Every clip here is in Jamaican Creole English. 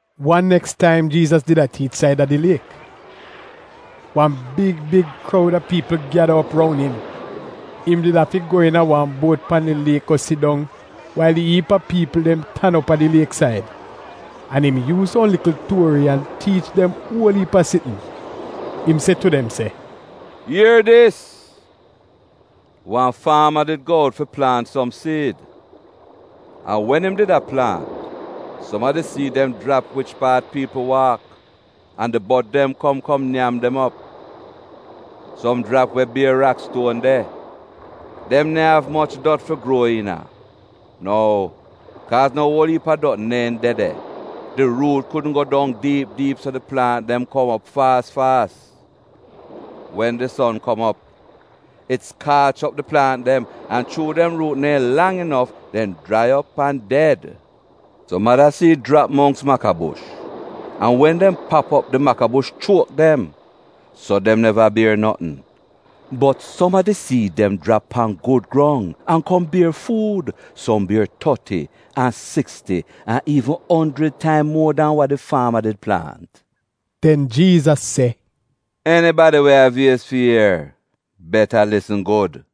Wan neks taim Jiizas did a tiich saida di liek. Wan big big kroud a piipl gyada op roun im. Im did afi go iina wan buot pan di liek go sit dong wail di iip a piipl dem tan op a di lieksaid. An im yuuz som likl tuori an tiich dem uol iip a sitn. Im se tu dem se, “Ier dis! Wan faama did go out fi plaant som siid. An wen im did a plaant, som a di siid dem jrap wich paat piipl waak, an di bod dem kom kom nyam dem op. Som jrap we bier rakstuon de. Dem neehn av moch dot fi gruo iina. Nou, kaaz no uol iip a dot neehn de de, di ruut kudn go dong diip diip so di plaant dem kom op faas faas. Wen di son kom op, it skaach op di plaant dem, an, chuu dem ruut neehn lang inof, dem jrai op an ded. Som ada siid jrap mongks makabush, an wen dem pap op di makabush chuok dem. So dem neva bier notn. Bot som a di siid dem jrap pan gud grong, an kom bier fuud. Som bier toti an siksti an iivn onjrid taim muo dan wa di faama did plaant.” Den Jiizas se, “Enibadi we av iez fi ier — beta lisn gud!”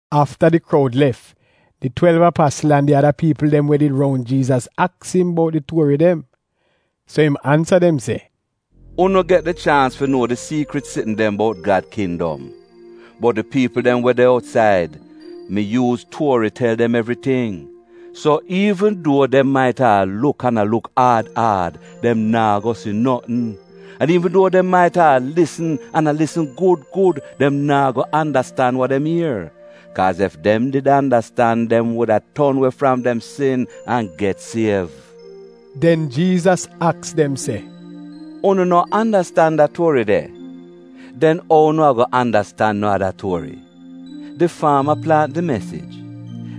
Afta di kroud lef, di twelv apasl an di ada piipl dem we did de roun Jiizas aks im bout di tuori dem. So im ansa dem se, “Unu get di chaans fi nuo di siikrit sitn dem bout Gad kindom. Bot di piipl dem we de outsaid, mi yuuz tuori tel dem evriting, so “ ‘Iivn duo dem maita a luk an a luk aad aad, dem naa go si notn, an iivn duo dem maita a lisn an a lisn gud gud dem naa go andastan wa dem ier, kaaz ef dem did andastan dem wuda ton we fram dem sin an get siev.’” Den Jiizas aks dem se: “Unu no andastan da tuori de? Den ou unu ago andastan no ada tuori? Di faama plaant di mesij.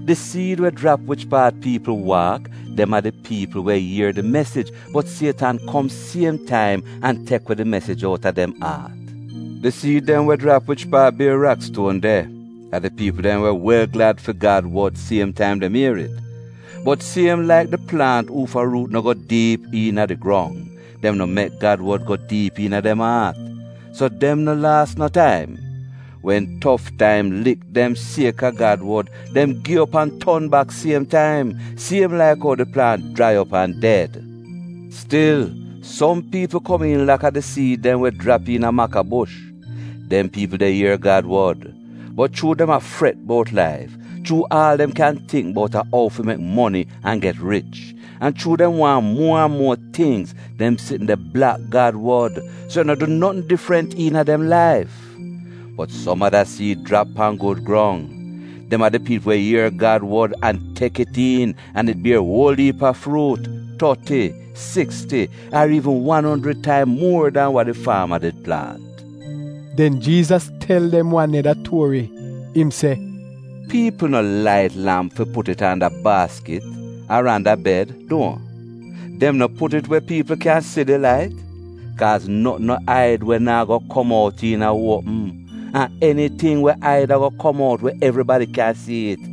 Di siid we jrap wich paat piipl waak, dem a di piipl we ier di mesij, bot Sietan kom siem taim an tek we di mesij outa dem aat. Di siid dem we jrap wich paat bier rakstuon de a di piipl dem we wel glad fi Gad wod siem taim dem ier it. Bot siem laik di plaant uufa ruut no go dong diip iina di grong, dem no mek Gad wod go diip iina dem aat, so dem no laas no taim. Wen tof taim lik dem sieka Gad wod, dem gi op an ton bak siem taim — siem laik ou di plaant jrai op an ded. Stil som piipl komiin laka di siid dem we jrap iina makabush. Dem piipl de ier Gad wod, bot chuu dem a fret bout laif, chuu aal dem kyaahn tingk bout a ou fi mek moni an get rich, an chuu dem waahn muo an muo tingz, dem sitn de blak Gad wod, so it no du notn difrant iina dem laif. Bot som ada siid jrap pan gud grong. Dem a di piipl we ier Gad wod an tek it iin an it bier uol iip a fruut: toti, siksti ar iivn wan onjrid taim muor dan wa di faama did plaant. Den Jiizas tel dem wan neda tuori, im se, “Piipl no lait lamp fi put it anda baaskit ar anda bed, duohn? Dem no put it we piipl kyan si di lait? Kaaz notn no aid we naa go kom out iina uopm, an eniting we aid ago kom out we evribadi kyan sii it.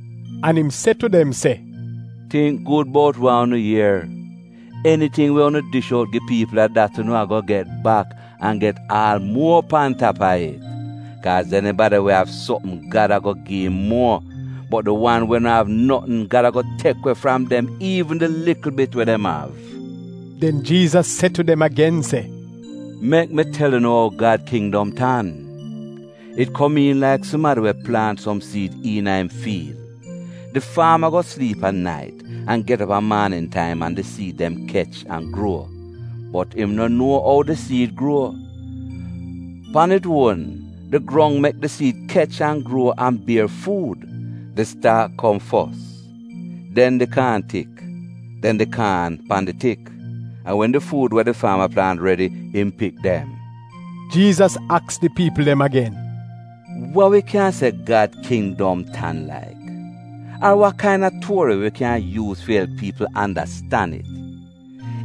An im se tu dem se, “Tingk gud bout wa unu ier. Eniting we unu dish out gi piipl a dat unu ago get bak, an get aal muo pan tap a it. Kaaz enibadi we av sopm Gad ago gi im muor, bot di wan we no av notn, Gad ago tek we fram dem iivn di likl bit we dem av.” Den Jiizas se tu dem agen se, “Mek mi tel unu ou Gad kindom tan. It komiin laik sumadi we plaant som siid iina im fiil. Di faama go sliip a nait an get op a maanin taim an di siid dem kech an gruo, bot im no nuo ou di siid gruo. Pan it uon di grong mek di siid kech an gruo an bier fuud. Di staak kom fos, dem di kaan tik, den di kaan pan di tik. An wen di fuud we di faama plaant redi, im pik dem.” Jiizas aks di piipl dem agen, “Wa wi kyan se Gad kindom tan laik? Ar wa kaina tuori wi kyan yuuz fi elp piipl andastan it?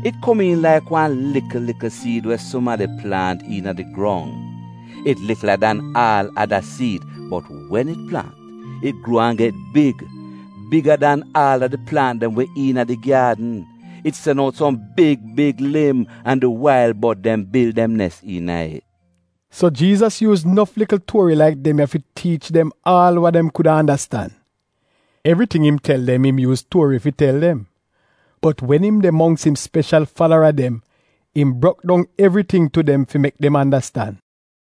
It komiin laik wan likl likl siid we sumadi plaant iina di grong. It likla dan aal ada siid, bot wen it plaant, it gruo an get big, biga dan aal a di plaant dem we iina di gyaadn. It sen out som big big lim an di wail bod dem bil dem nes iina it.” So Jiizas yuuz nof likl tuori laik dem ya fi tiich dem aal wa dem kuda andastan. Evriting im tel dem im yuuz tuori fi tel dem. Bot wen im de mongks im speshal falara dem, im brok dong evriting tu dem fi mek dem andastan.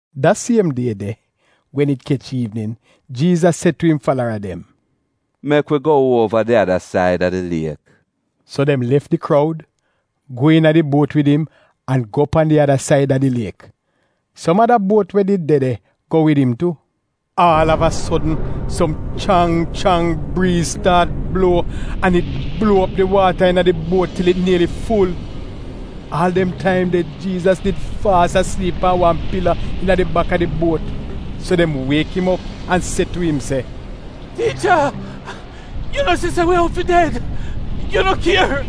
Da siem die de, wen it kech iivnin, Jiizas se tu im falara dem, “Mek wi go uova di ada said a di liek.” So dem lef di kroud, go iina di buot wid im, an go pan di ada said a di liek. Som ada buot we did de de go wid im tu. Aal av a sodn, som chrang chrang briiz staat bluo, an it bluo op di waata iina di buot til it nieli ful. Aal dem taim de Jiizas did faas a sliip pan wan pila iina di bak a di buot. So dem wiek im op an se tu im se, “Tiicha, yu no si se wi out fi ded, yu no kier?”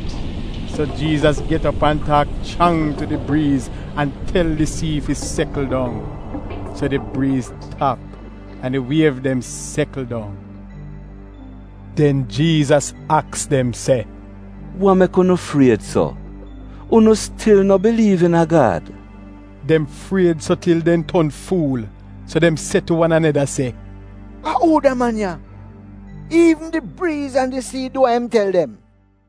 So Jiizas get op an taak chrang tu di briiz, an tel di sii fi sekl dong. So di briiz tap an di wiev dem sekl dong. Den Jiizas aks dem se, “Wa mek unu fried so? Unu stil no biliiv iina Gad?” Dem fried so til dem ton fuul, so dem se tu wan aneda se, “A uu da man ya? Iivn di briiz an di sii dem du wa im tel dem!”